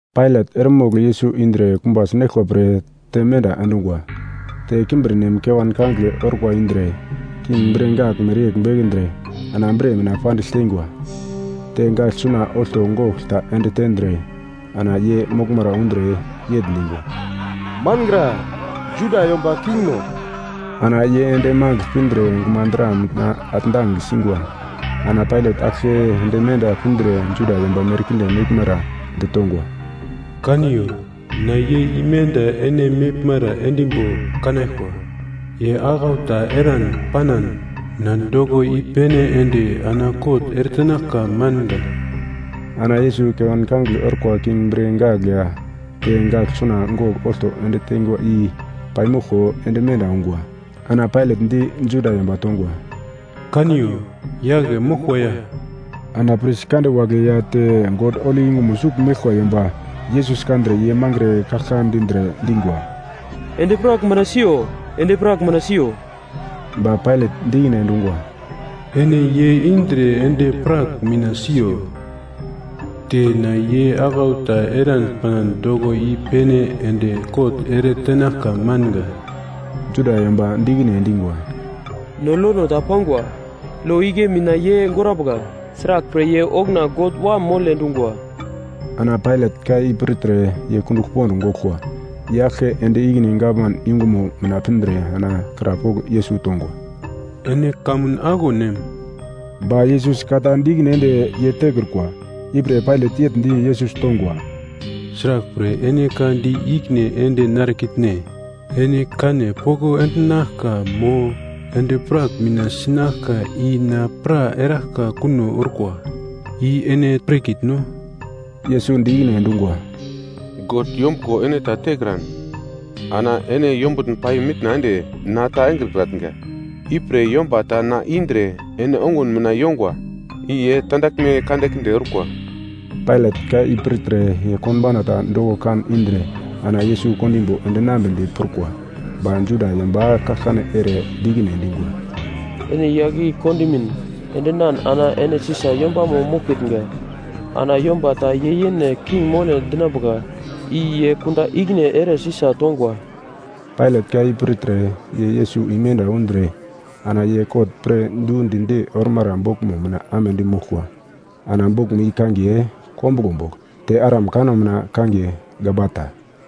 Pailat eremogl Yesus indre kumba sinaglkwa pre te menda endungwa. Te kimbirnem kewan kangigle orkwa indre king bre gagl mereyegl bekendre ana bre mina pandigl teingwa. Te gagl suna olto gogl ta ende tendre, ana ye moglmara undre yegl dingwa, “Mangra, Juda yomba kingno!” Ana ye ende magl pindre gumadra mina atndang singwa. Ana Pailat aglke ende menda pindre Juda yomba merkinde meglmara ditongwa, “Kaniyo na ye imenda ene meglmara endimbo kanaglkwa. Ye aglau ta eran panan na doko i-pene ende ana kot ere tenaglka manga.” Ana Yesus kewan kangigle orkwa king bre gagl ya te gagl suna gogl olto ende teingwa i paimoglko ende menda ungwa. Ana Pailat di Juda yomba tongwa, “Kaniyo! Yagle moglkwa ya.” Ana pris kande wagle ya te God holi yungumo sugl meglkwa yomba Yesus kandre ye mangre kaglka dindre dingwa, “Endi-prak mina siyo! Endi-prak mina siyo!” Ba Pailat di ikine endungwa, “Ene ye indre endi-prak mina siyo te na ye aglau ta eran panan doko i-pene ende kot ere tenaglka manga.” Juda yomba di ikine endingwa, “No lono ta pangwa, lo igle mina ye gorambuka, sraglpre ye okuna God Wam mole dungwa.” Ana Pailat ka i pirtre ye kundugl pond goglkwa. Ye aglke ende ikine gavman yungumo mina pindre ana krapogl Yesus tongwa, “Ene kamun aglo nem?” Ba Yesus ka ta di ikine ende ye tekrukwa. Ipre Pailat yegl di Yesus tongwa, “Sraglpre ene ka di ikine ende narekitne? Ene kane poko endinaglka mo endi-prak mina sinaglka i na pra eraglka kuno orkwa, i ene pirkitno?” Yesus di ikine endungwa, “God yombuglo ene ta tekran ana ene yombutn pai mitna ende na ta engrekratnga, ipre yomba ta na indre ene ongun mina yongwa i ye tandaglme kandekinde orkwa.” Pailat ka i pirtre ye konbauna ta doko kan indre ana Yesus kondimbo endinambedi prukwa. Ba Juda yomba kaglkane ere di ikine endingwa, “Ene yagl i kondimin endinan ana ene Sisa yombamo moglkitnga. Ana yomba ta ye yene king mole dinambuka i ye kunda ikine ere Sisa tongwa.” Pailat ka i pirtre ye Yesus imenda undre ana ye kot pir du di-di ormara boglmo mina amedi moglkwa. Ana boglmo i kangiye “Kombuglo bogl”. Te Aram kanno mina kangiye “Gabata”.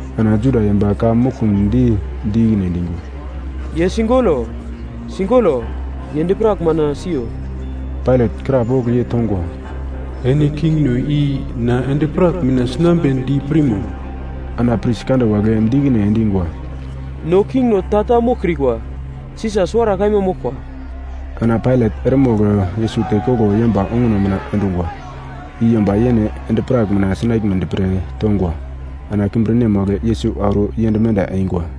Ana Juda yomba ka muglkumdi di ikine endingwa, “Ye sigolo! Sigolo! Ye endi-prak mina siyo!” Pailat krapogl ye tongwa, “Ene kingno i na endi-prak mina sinambedi pirmo?” Ana pris kande wagle di ikine endingwa, “No kingno ta-ta moglkrikwa, Sisa suwara kaima moglkwa.” Ana Pailat eremogl Yesus tekoglo yomba onguno mina endungwa, i yomba yene endi-prak mina sinaglmedi pre tongwa. Ana kimbirnem wagle Yesus auro yend menda eingwa.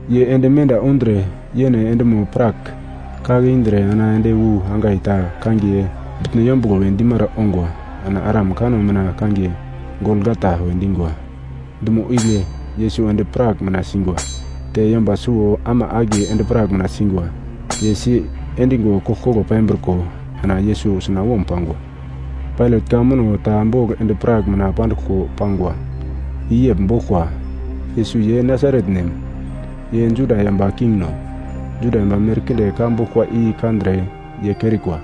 Ye ende menda undre, yene endimo-prak kake indre ana ende wu angai ta kangiye Bitno Yombuglo we dimara ongwa. (Ana Aram kanno mina kangiye “Golgata” we dingwa.) Dumo igle Yesus endi-prak mina singwa. Te yomba suwo ama akiye endi-prak mina singwa, ye si endingo koglkoglo pambriko ana Yesus sunawom pangwa. Pailat ka muno ta bogl endi-prak mina panduglko pangwa. I yegl boglkwa, “Yesus ye Nasaret nem, ye Juda yomba kingno.” Juda yomba merkinde ka boglkwa i kandre ye kerikwa.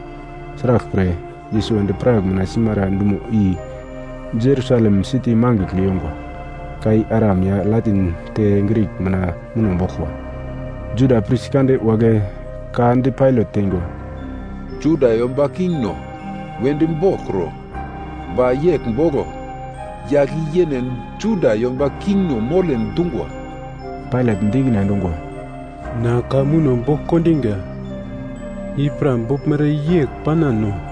Sraglpre, Yesus endi-prak mina simara dumo i Jerusalem siti mangigl yongwa. Ka i Aram ya Latin te Grik mina muno boglkwa. Juda pris kande wagle ka di Pailat teingwa, “‘Juda yomba kingno’ wedi boglkro.” Ba yegl boglo, ‘Yagl i yene Juda yomba kingno mole dungwa.’” Pailat di ikine endungwa, “Na ka muno bogl kondinga, i pra boglmere yegl panano.”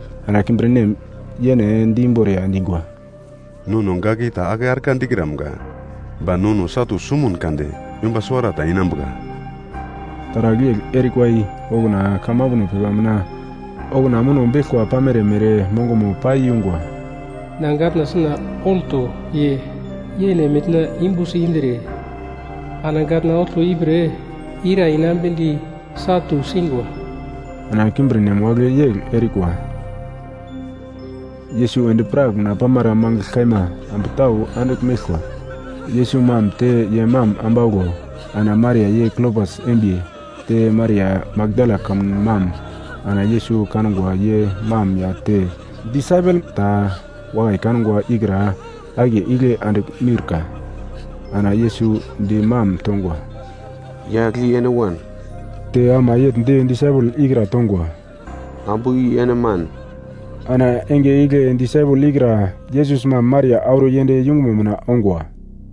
Ana kimbirnem yene di imboriya endingwa, “Nono gagl i ta ake argla dikramga, ba nono satu sumun kade yomba suwarata inambuka.” Taragl yegl erikwa i okuna kamambuno pepa mina okuna muno beglkwa pamere mere mongomo paiyungwa. “Na gatna suna olto ye yene mina yumbusi indre ana gatna olto ipre ira inambedi satu singwa.” Ana kimbirnem wagle yegl erikwa. Yesus endi-prak mina pamara mangigl kaima ambu tau andigl meglkwa, Yesus mam te ye mam ambauglo, ana Maria ye Klopas embiye te Maria Makdala kamun mam. Ana Yesus kangwa ye mam ya te disaipel ta wakai kangwa ikra akiye igle andigl miurka, ana Yesus di mam tongwa, “Yagl i ene wan.” Te ama yegl di disaipel ikra tongwa, “Ambu i ene man.” Ana enge igle disaipel ikra Yesus mam Maria auro yend yungumo mina ongwa.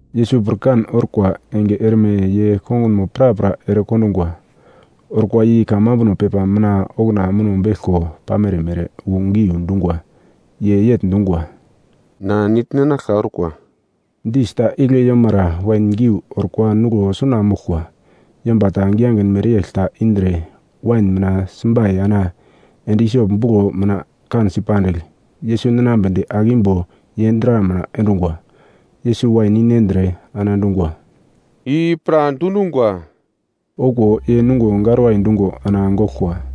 Yesus pirkan orkwa enge erme ye kongunmo prapra erekondungwa, orkwa i kamambuno pepa mina okuna muno beglko pamere mere wu giu dungwa, ye yegl dungwa, “Na nigl ninaglka orkwa.” Dis ta igle yomara wain geu orkwa nuglo suna moglkwa, yomba ta giyagin mereyegl ta indre wain mina simbai ana endi isop buglo mina kansi pandigl, Yesus ninambedi ake imbo ye dra mina endingwa. Yesus wain i nendre ana dungwa, “I pra dundungwa.” Okuwo ye nungo garwai dungo ana goglkwa.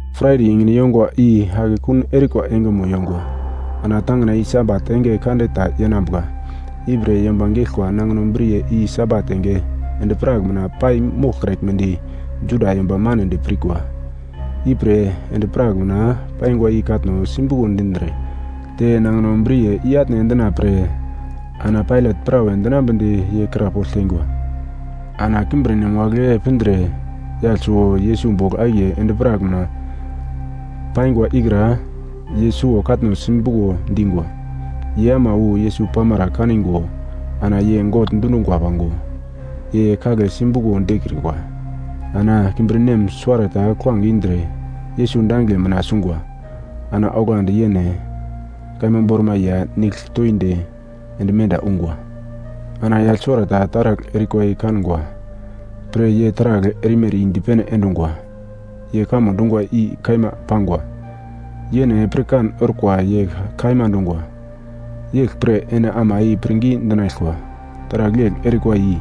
Fraide enge yongwa i akekun erikwa engemo yongwa, ana tangina i Sabat enge kande ta yenambuka, i pre yomba geglkwa nangino briye i Sabat enge endi-prak mina pai moglkraglmedi Juda yomba manedi pirkwa. Ipre endi-prak mina paingwa i katno simbuko dindre te nangino briye i-atne endina pre ana Pailat prawe dinambedi ye krapogl teingwa. Ana kimbirnem wagle pindre yagl suwo Yesus bogl akiye endi-prak mina paingwa ikra ye suwo katno simbuko dingwa. Ye ama wu Yesus pamara kaningo ana ye gogl dundungwa pango, ye kagle simbuko dikrikwa. Ana kimbirnem suwarata kuglange indre Yesus dangigle mina sungwa, ana oglandi yene kaima bormai ya te nigl toindi ende menda ungwa. Ana yagl suwarata taragl erikwa i kangwa pre ye taragl erimere i dipene endungwa, ye kamo dungwa i kaima pangwa. Yene pirkan orkwa ye ka kaima dungwa. Yeglpre ene ama i pirngi dinaglkwa. Taragl yegl erikwa i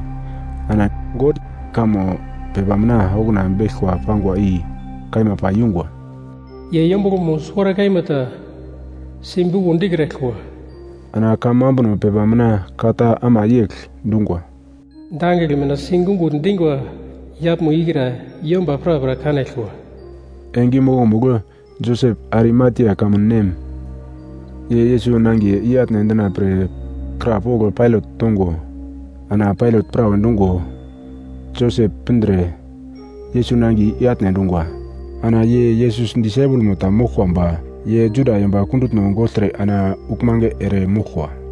ana God kamo pepa mina okuna beglkwa pangwa i kaima pai yungwa, “Ye yombuglomo suwara kaima ta simbuko dikraglkwa.” Ana kamambuno pepa mina ka ta ama yegl dungwa, “Dangigle mina sigungugl dingwa yaglmo ikra yomba prapra kanaglkwa.” Enge i mokomugl, Josep, Arimatia kamun nem, ye Yesus nangiye i-atne endina pre krapogl Pailat tongo, ana Pailat prawe dungo, Josep pindre Yesus nangiye i-atne endungwa. (Ana ye Yesus disaipelmo ta moglkwa ba ye Juda yomba kundutno gogltre ana uglmange eremoglkwa.)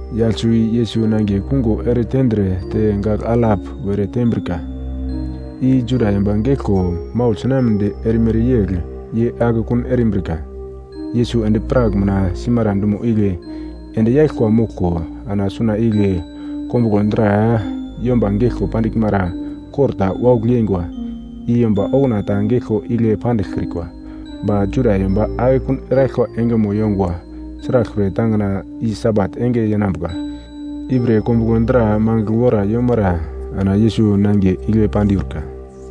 Yagl suwo i Yesus nangiye kungo eretendre te gagl alap were tembrika, i Juda yomba geglko maugl sinamnedi erimere yegl ye akekun erimbrika. Yesus endi-prak mina simara dumo igle endi yaglkwa moglko, ana suna igle kombuglo dra yomba geglko pandiglmara kor ta waugl yeingwa, i yomba okuna ta geglkwa igle pandiglkrikwa. Ba Juda yomba akekun eraglkwa engemo yongwa, sraglpre tangina i Sabat enge yenambuka. Ipre kombuglo dra mangigl wora yomara ana Yesus nangiye igle pandiurka.